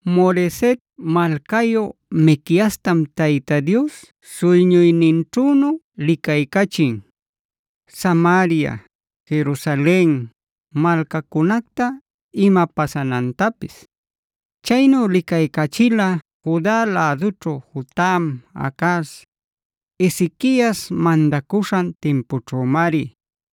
Moreset malcayu Miqueastam Tayta Dios suyñuyninćhünu licaycachin, Samaria, Jerusalen malcacunacta ima pasanantapis. Chaynu licaycachila Juda lädućhu Jotam,a Acaz,b Ezequiasc mandacuśhan timpućhümari.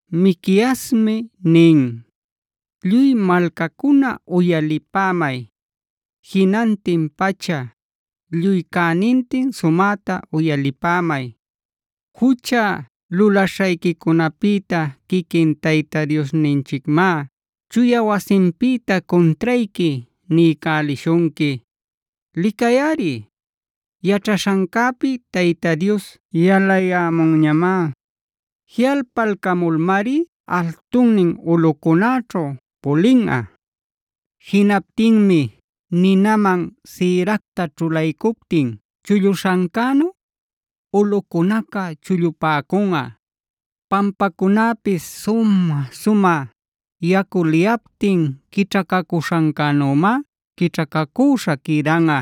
Miqueasmi nin: “Lluy malcacuna uyalipämay. Jinantin pacha, lluy cänintin, sumäta uyalipämay. Jucha lulaśhayquicunapïta quiquin Tayta Diosninchicmá chuya wasinpïta cuntrayqui niycälishunqui. Licayꞌari, yaćhaśhancäpi Tayta Dios yalayämunñamá. Jiꞌalpaycamulmari altunnin ulꞌucunäćhu pulinꞌa. Jinaptinmi ninaman sïracta ćhulaycuptin chulluśhancänu,d ulꞌucunaca chullupäcunꞌa. Pampacunäpis sumä-sumä yacu liyaptin quićhacacuśhancänümá quićhacacüśha quïdanꞌa.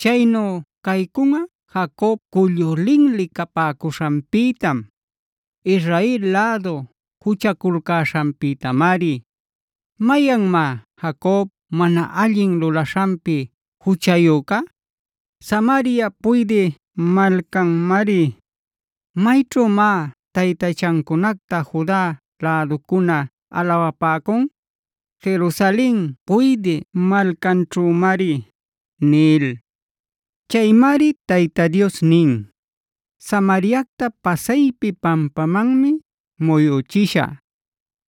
Chaynu caycunꞌa Jacob cullu linli capäcuśhanpïtam, Israel lädu juchaculcäśhanpïtamari. ¿Mayanmá Jacob mana allin lulaśhanpi juchayüca? Samaria puydï malcanmari. ¿Mayćhümá taytachacunacta Juda läducuna alawapäcun? Jerusalen puydï malcanćhümari” nil. Chaymari Tayta Dios nin: “Samariacta pasaypi pampamanmi muyüchishä;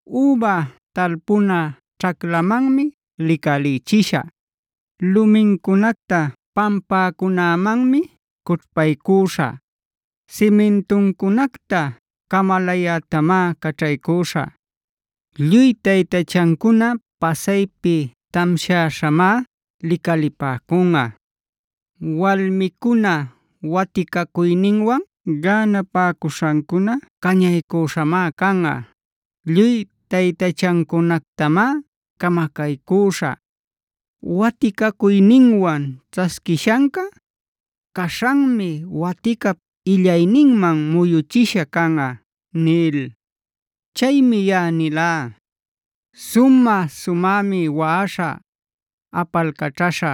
üba talpuna ćhaclamanmi licalïchishä. Lumincunacta pampacunämanmi cućhpaycüśhä; simintuncunacta camalayätamá caćhaycüśhä. Lluy taytachancuna pasaypi tamshäśhamá licalipäcunꞌa; walmicuna waticacuyninwan gänapacuśhancuna cañaycüśhamá canꞌa. Lluy taytachancunactamá camacaycüśhä. Waticacuyninwan ćhasquishanca, caśhanmi waticap illayninman muyuchisha canꞌa” nil. Chaymi yaꞌa nilá: “Sumä-sumämi waꞌaśhä, apalcaćhaśhä;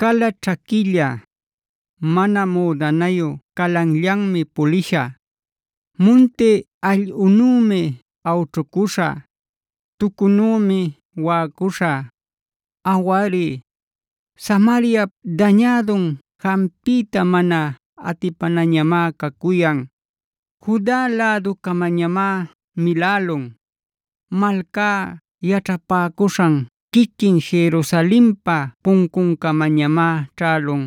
cala ćhaquilla, mana müdanayu calanllanmi pulishä. Munti allꞌunümi awćhucuśhä; tucunümi waꞌacuśhä. Awari, Samariap dañädun jampiyta mana atipanañamá cacuyan; Juda läducamañamá milälun. Malcá yaćhapäcuśhan quiquin Jerusalenpa puncuncamañamá ćhälun.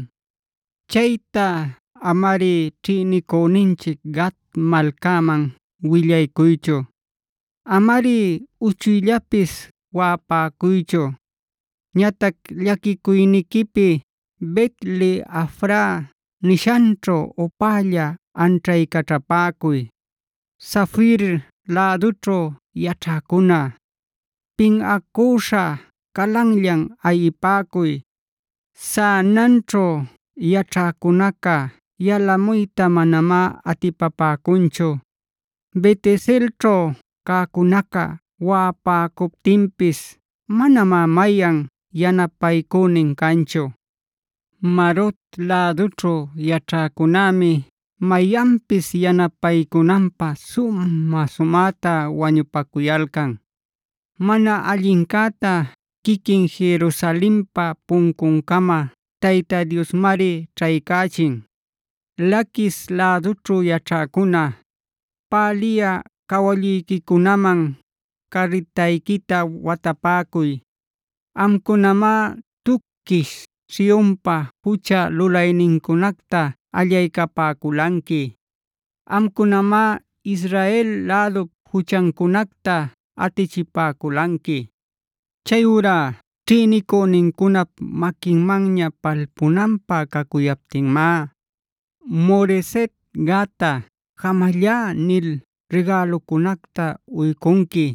Chayta amari ćhïnicüninchic Gat malcaman willaycuychu; amari uchuyllapis waꞌapäcuychu. Ñatac llaquicuyniquipi Bet-le-afrae nishanćhu upälla anćhaycaćhapäcuy. Safirf lädućhu yaćhäcuna, pinꞌacüśha calanllan ayipäcuy. Zaananćhug yaćhäcunaca yalamuyta manamá atipapäcunchu. Beteselćhuh cäcunaca waꞌapäcuptinpis manamá mayan yanapaycünin canchu. Marot lädućhu yaćhäcunämi mayanpis yanapaycunanpä sumä-sumäta wañupacuyalcan. Mana allincäta quiquin Jerusalenpa puncuncama Tayta Diosmari ćhaycachin. “Laquisi lädućhu yaćhäcuna, päliyä cawalluyquicunaman carritayquita watapäcuy. Amcunamá tuquish Sionpa jucha lulaynincunacta allaycapäculanqui. Amcunamá Israel lädup juchancunacta atichipäculanqui. Chayurá ćhïnicünincunap maquinmanña palpunanpä cacuyaptinmá Moreset-gattaj ‘jamallá’ nil rigälucunacta uycunqui.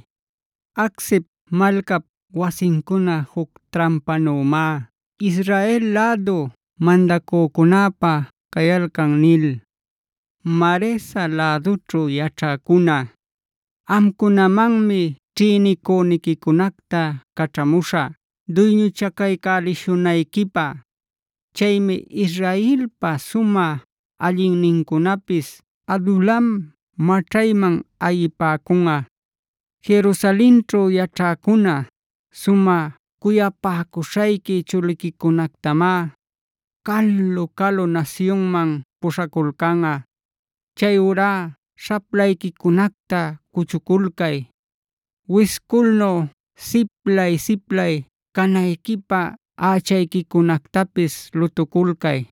Aczibk malcap wasincuna juc trampanümá Israel lädu mandacücunäpä cayalcan” nil. Maresal lädućhu yaćhäcuna, amcunamanmi ćhïnicüniquicunacta caćhamuśhä duyñuchacaycälälishunayquipä. Chaymi Israelpa sumä allinnincunapis Adulam maćhayman ayipäcunꞌa. Jerusalenćhu yaćhäcuna, sumä cuyapäcuśhayqui chuliquicunactamá calu-calu nasyunman puśhaculcanꞌa. Chayurá śhaplayquicunacta cuchuculcay; wisculnu siplay-siplay canayquipä ächayquicunactapis lutuculcay.